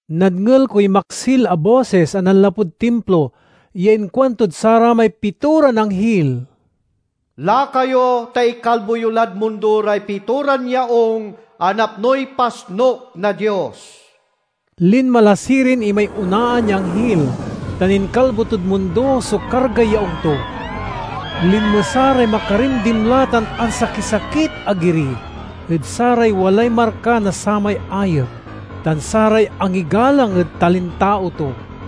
Nadngel koy maksil a bosis a nanlapud timplo ya inkuantod saramay pitoran anghil, "Laka yo ta ikalbo yo lad mundo ray pitoran yaung a napnoy pasnuk na Dios!" Linma la sirin imay onaan ya anghil, tan inkalbo tod mundo so kargay yaung to. Linmesa ray makarimdimla tan ansakisakit a giri ed saray walay marka na samay ayep, tan saray angigalang ed talintao to.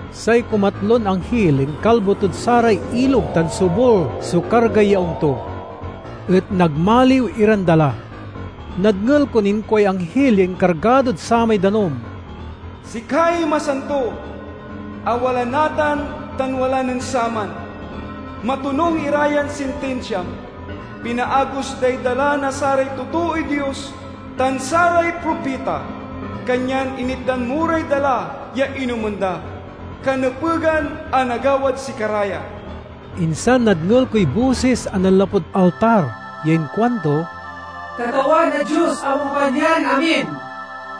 Say kumatlon angnil inkalbo tod saray ilog tan sobul so kargay yaung to, et nagmaliw iran dala. Nadngel kon inkuay anghil ya inkargadod samay danum, "Sikay Masanto, a wala natan tan wala nen saman! Matonung ira yan sintinsiam. Pinaagos day dala na saray totooy Dios tan saray propita, kanyan initdan mo ray dala ya inomen da. Kanepegan a nagawad sikara ya!" Insan nadngel koy bosis a nanlapud altar ya inkuanto, "Katawan a Dios a Makapanyarin-amin,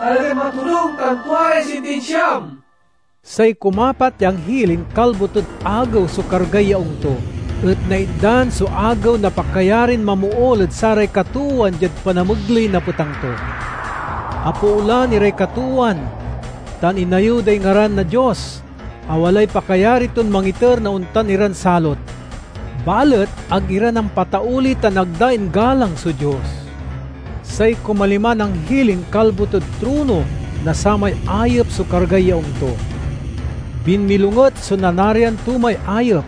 talagan matonung tan tua ray sintinsiam!" Say kumapat ya anghil inkalbo tod agew so kargay yaung to, et naitdan so agew na pakayarin mamool ed saray katoowan diad panamegley na petang to. Apoolan iray katoowan, tan inayew day ngaran na Dios a walay pakayari ton mangiter na ontan iran salot. Balet ag ira nampatauli tan ag da inggalang so Dios. Say kumaliman anghil inkalbo tod trono na samay ayep so kargay yaung to. Binmilonget so nanarian to may ayep,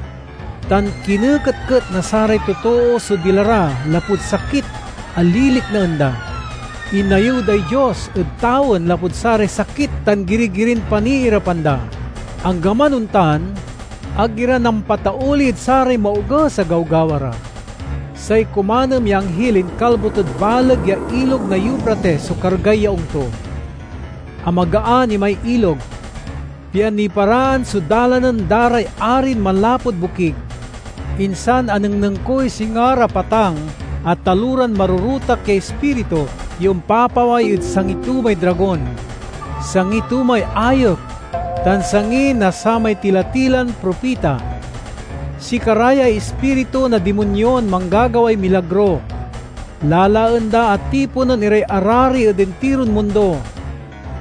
tan kineketket na saray totoo so dila ra lapud sakit a liliknaen da. Inayew day Dios ed tawen lapud saray sakit tan giri-girin paniirapan da. Anggaman ontan, ag ira nampatauli ed saray maoges a gawgawa ra. Say kumanem ya anghil inkalbo tod baleg ya Ilog na Eufrates so kargay yaung to. Amagaan imay ilog, pian niparaan so dalanen da ray arin manlapud bokig. Insan anengneng koy singa ra patang a taloran marorotak ya ispiritu ya ompapaway ed sangi to may dragon, sangi to may ayep, tan sangi na samay tila-tilan propita. Sikara yay ispiritu na dimonyon manggagaway milagro. Lalaen da a tiponen iray arari ed intiron mundo,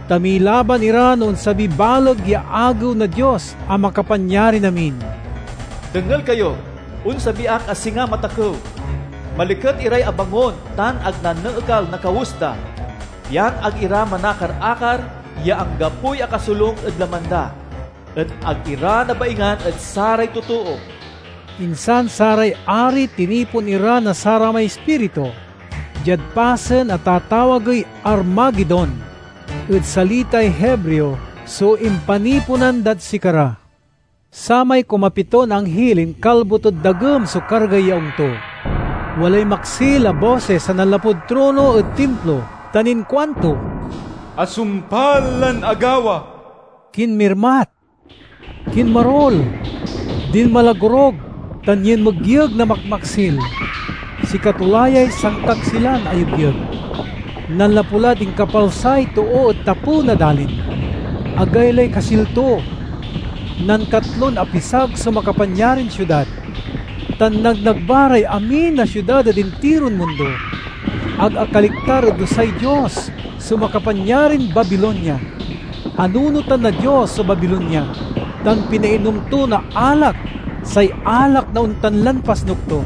ta milaban ira no onsabiy baleg ya agew na Dios a Makapanyarin-amin. "Dengel kayo! Onsabi ak a singa matakew! Maliket iray abangon tan ag naneekal na kawes da, pian ag ira manakar-akar ya anggapoy akasolung ed laman da, et ag ira nabaingan ed saray totoo!" Insan saray ari tinipon ira na saramay ispiritu; diad pasen a tatawagey Armagedon ed salitay Hebreo so impaniponan dad sikara. Samay kumapiton anghil inkalbo tod dagem so kargay yaung to. Walay maksil a bosis a nanlapud trono ed timplo tan inkuanto, "Asumpal lan agawa!" Kinmirmat, kinmarul, dinmalagorug, tan yinmegyeg na makmaksil. Sikato la yay sankaksilan a yegyeg, nanlapu lad inkapalsay too ed tapew na dalin. Agaylay kasil to! Nankatlon apisag so makapanyarin siudad, tan nagnagba ray amin a siudad ed intiron mundo. Ag akaliktar ed dusay Dios so makapanyarin Babilonia. Anunotan na Dios so Babilonia, tan pinainom to na alak, say alak na ontan lan pasnuk to.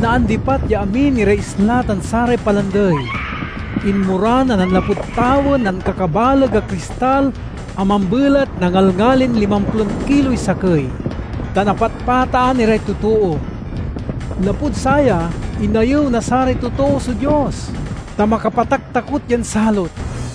Naandipat ya amin iray isla tan saray palandey. Inmoran a nanlapud tawen na ankakabaleg a kristal a mambelat na ngalngalin limamplon kiloy sakey, tan apatpataan iray totoo. Lapud saya, inayew na saray totoo so Dios, ta makapataktakot yan salot!